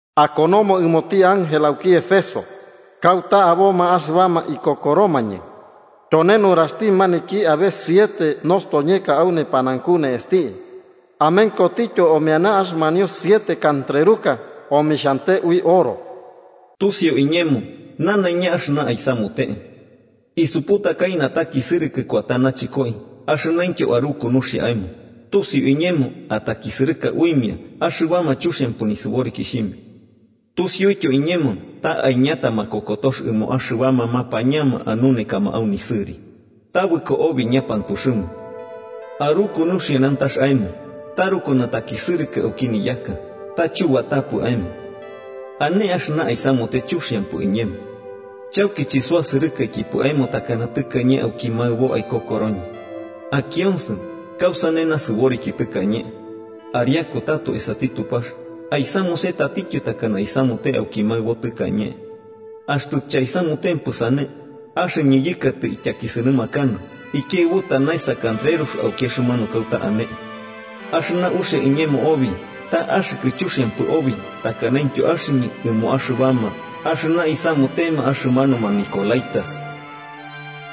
“Akonomo ɨmoti ángel auki Éfeso kauta aboma axɨbama ikokoromañɨ: ‘Tyone nuraxti maniki abe siete nostoñeka au nepanaunku ne'esti amenkotityo omeana axɨmanio siete kantreruka omixhante ui oro: Tusiu iñemo nanaiña axɨna aisamute. Isuputakai natakisɨrɨkɨ kuata nachɨkoi axɨnaintyo aruku nuxia aemo, tusiu iñemo atakisɨrɨka uimia axɨbama chuxiampɨ nisɨborikixhimia. Tusiuityo iñemo ta aiñata makokotox ɨmoma axɨbama mapañama anunekama au nisɨri, tabɨko obi ñapantuxɨma. Aruku nuxia nantax aemo, taruku natakisɨrɨkɨ auki niyaka, ta chubatapɨ aemo. Ane axɨna aisamute chuxiampɨ iñemo: chauki chisuasɨrɨkaikipɨ aemo takana tɨkañe auki maɨbo aikokoroñɨ. Akionsɨ, kausane nasɨboriki tɨkañe, ariaku tato esati Tupax aisamuse tatityo takana aisamute auki maɨbo tɨkañe. Axtɨ chaisamutempɨ sane, axɨñɨ yɨkatɨ ityakisɨnɨmakanɨ ikiaɨbuta naesa kantrerux auki axɨmanu kauta ane. Axɨna uxia iñemo obi, ta axɨkɨ chuxiampɨ obi takanaintyo axɨñɨ ɨmoma axɨbama axɨna isamutema axɨmanuma nicolaítas.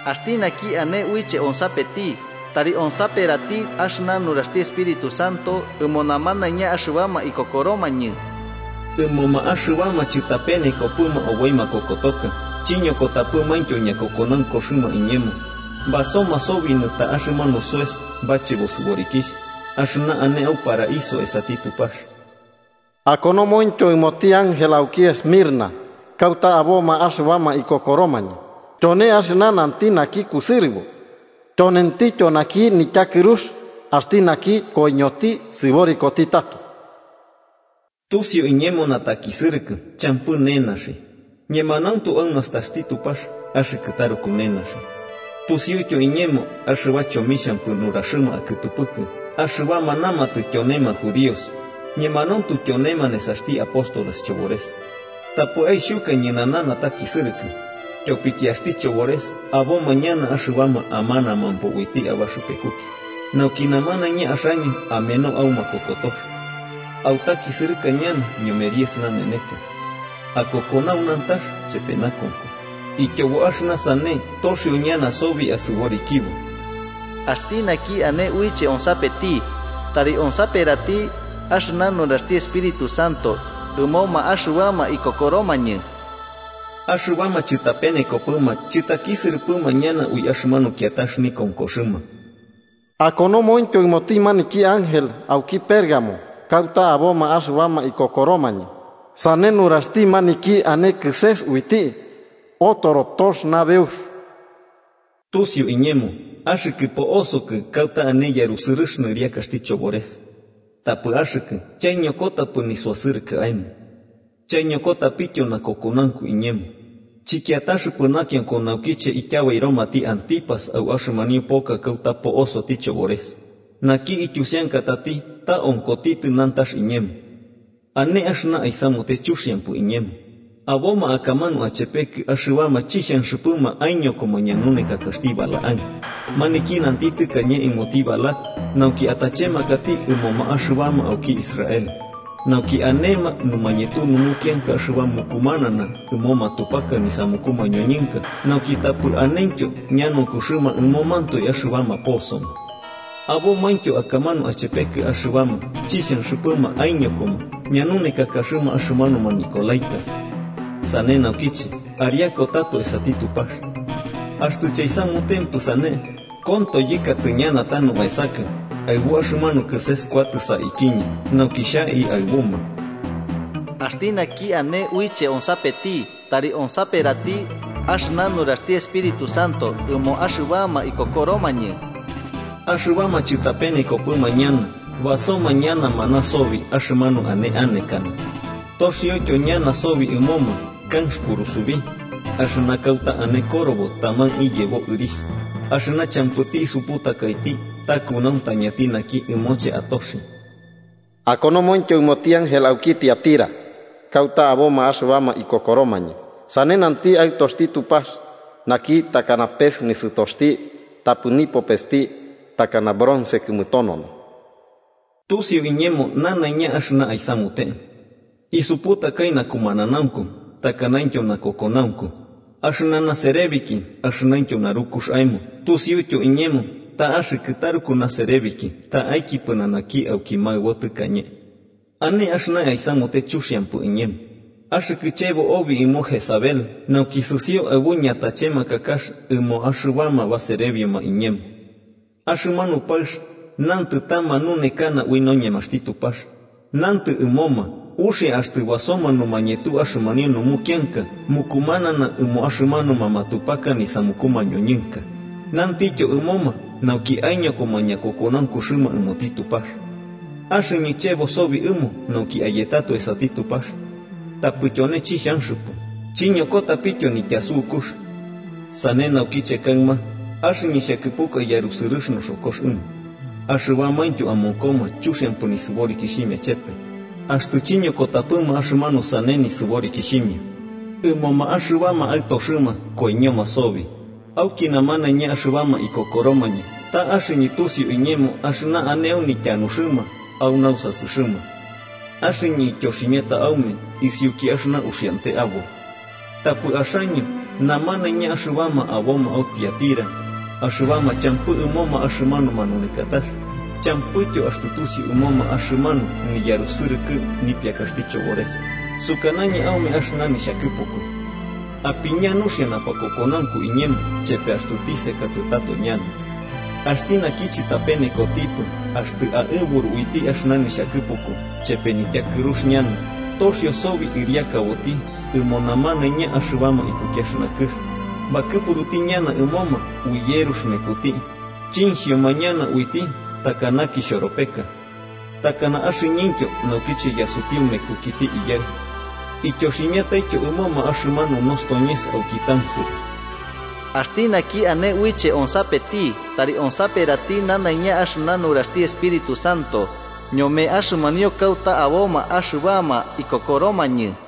¡Axti naki ane uiche onsapeti, tari onsaperati axɨna nuraxti Espíritu Santo ɨmo namanaiña axɨbama ikokoromañɨ! Ɨmoma axɨbama chɨtapenekopɨma oboi makokotoka chiñokotapɨmaintyo ñakokonaunkuxɨma iñemo, basoma sobi nɨta axɨmanu soes bachebo sɨborikixh, axɨna ane au Paraíso esati Tupax.’ “Akonomointyo ɨmoti ángel auki Esmirna kauta aboma axɨbama ikokoromañɨ: ‘Tyone axɨna nanti naki kusɨrɨbo tyonentityo naki nityakɨrux, axti naki koiñoti sɨborikoti tato: Tusiu iñemo natakisɨrɨkɨ champɨ nenaxi, ñemanauntu au nastaxti Tupax axɨkɨ taruku nenaxi. Tusiuityo iñemo axɨba chomixhampɨ nuraxɨma akɨtɨpɨkɨ axɨbama namatɨ tyonema judíos, ñemanauntu tyonema nesaxti apóstoles chobores. Tapɨ aixhuka ñɨnana natakisɨrɨkɨ, tyopiki axti chobores aboma ñana axɨbama amanamampo uiti abaxɨpekuki, nauki namanaiña axaño ameno au makokotox. Autakisɨrɨka ñana ñome diez naneneka. Akokonau nantax chepe nakonko, ityobo axɨna sane toxio ñana sobi asɨborikibo. ¡Axti naki ane uiche onsapeti, tari onsaperati axɨna nuraxti Espíritu Santo ɨmoma axɨbama ikokoromañɨ! Axɨbama chɨtapenekopɨma chɨtakisɨrɨpɨma ñana ui axɨmanu kiatax nikonkoxɨma.’ “Akonomointyo ɨmoti maniki ángel auki Pérgamo kauta aboma axɨbama ikokoromañɨ: ‘Sane nuraxti maniki ane kɨses uiti otoro tox nabeux: Tusiu iñemo axɨkɨ poosokɨ kauta ane yarusɨrɨx nɨriakaxti chobores. Tapɨ axɨkɨ chaiñokotapɨ nisuasɨrɨkɨ aemo. Chaiñokotapityo nakokonaunku iñemo, chɨkiataxɨpɨ nakionko naukiche ityabairomati Antípas au axɨmanio poka kauta po'osoti chobores, naki ityusiankatati ta onkotitɨ nantax iñemo. Ane axɨna aisamute chuxiampɨ iñemo: aboma akamanu achepekɨ axɨbama chixhanxɨpɨma aiñokoma ñanunekakaxti Balaam, maniki nanti tɨkañe ɨmoti Balac nauki atachemakati ɨmoma axɨbama auki Israel, nauki anema numañetu numukianka axɨba mukumanana ɨmo matupaka nisamuku mañoñɨnka nauki tapɨ anentyo ñanaunkuxɨma ɨmomantoe axɨbama posoma. Abomaintyo akamanu achepekɨ axɨbama chixhanxɨpɨma aiñokoma ñanunekakaxɨma axɨmanuma nicolaítas. Sane naukiche ariaku tato esati Tupax. Axtɨ chaisamutempɨ sane, konto yɨkatɨ ñana tanu aesakɨ, aɨbu axɨmanu kɨses kuatɨ saikiñɨ nauki xhai aɨbuma. ¡Axti naki ane uiche onsapeti, tari onsaperati axɨna nuraxti Espíritu Santo ɨmoma axɨbama ikokoromañɨ! Axɨbama chɨtapenekopɨma ñana basoma ñana maná sobi axɨmanu ane anekana. Toxioityo ñana sobi ɨmoma kanx purusubi, axɨna kauta ane korobo taman iyebo ɨrixh, axɨna champɨti isuputakaiti ta kunauntañati naki ɨmoche atoxi.’ “Akonomointyo ɨmoti ángel auki Tiatira kauta aboma axɨbama ikokoromañɨ: ‘Sane nanti Aɨtoxti Tupax, naki takana pes nisɨtoxti tapɨ nipopesti takana bronce kɨmɨtonono: Tusiu iñemo nanaiña axɨna aisamute. Isuputakai nakumananaunku takanaintyo nakokonaunku, axɨna naserebiki axɨnaintyo narukux aemo Tusiuityo iñemo ta axɨkɨ taruku naserebiki ta'aiki pɨnanaki auki maɨbo tɨkañe. Ane axɨna aisamute chuxiampɨ iñemo, axɨkɨ chebo obi ɨmo Jezabel nauki sɨsio aɨbu ñatachemakakax ɨmoma axɨbama baserebioma iñemo. Axɨmanu paɨx nantɨ ta manunekana ui noñemaxti Tupax, nantɨ ɨmoma uxia axtɨ basoma numañetu axɨmanio numukianka mukumanana ɨmoma axɨmanuma matupaka nisamuku mañoñɨnka, nantityo ɨmoma nauki aiñokoma ñakokonaunkuxɨma ɨmoti Tupax. Axɨñɨ chebo sobi ɨmo nauki ayetɨ tato esati Tupax. Tapɨ tyone chixhanxɨpɨ chiñokotapityo nityasukux. Sane naukiche kaɨma, axɨñɨ xhakɨpuka yarusɨrɨx noxokox ɨmo, axɨbamaintyo amonkoma chuxiampɨ nisɨborikixhimia chepe, aɨxtɨ chiñokotapɨma axɨmanu sane nisɨborikixhimia. Ɨmoma axɨbama aɨtoxɨma koiñoma sobi, auki namanaiña axɨbama ikokoromañɨ ta axɨñɨ tusiu iñemo axɨna ane au nityanuxɨma au nausasɨxɨma. Axɨñɨ ityoximiata aume isiuki axɨna uxiante aboi. Tapɨ axaño namanaiña axɨbama aboma au Tiatira, axɨbama champɨ ɨmoma axɨmanu manunekatax, champɨityo axtɨ tusiu ɨmoma axɨmanu niyarusɨrɨkɨ nipiakaxti chobores, sukanañɨ aume axɨna nixhakɨpuku. Apiña nuxia napakokonaunku iñemo chepe axtɨ tisekatɨ tato ñana. Axti naki chɨtapenekotipɨ axtɨ aɨburu uiti axɨna nixhakɨpuku chepe nityakɨrux ñana, toxio sobi ɨriakaboti ɨmoma namanaiña axɨbama ikuki axɨna kɨx, bakɨpuruti ñana ɨmoma ui yerux mekuti, chinxhioma ñana uiti takana kixhoropeka. Takana axɨñɨntyo naukiche yasutiu mekukiti Iyaɨ. Ityoximiataityo ɨmoma axɨmanu nostoñes auki tansɨrɨ. ¡Axti naki ane uiche onsapeti, tari onsaperati nanaiña axɨna nuraxti Espíritu Santo ñome axɨmanio kauta aboma axɨbama ikokoromañɨ!’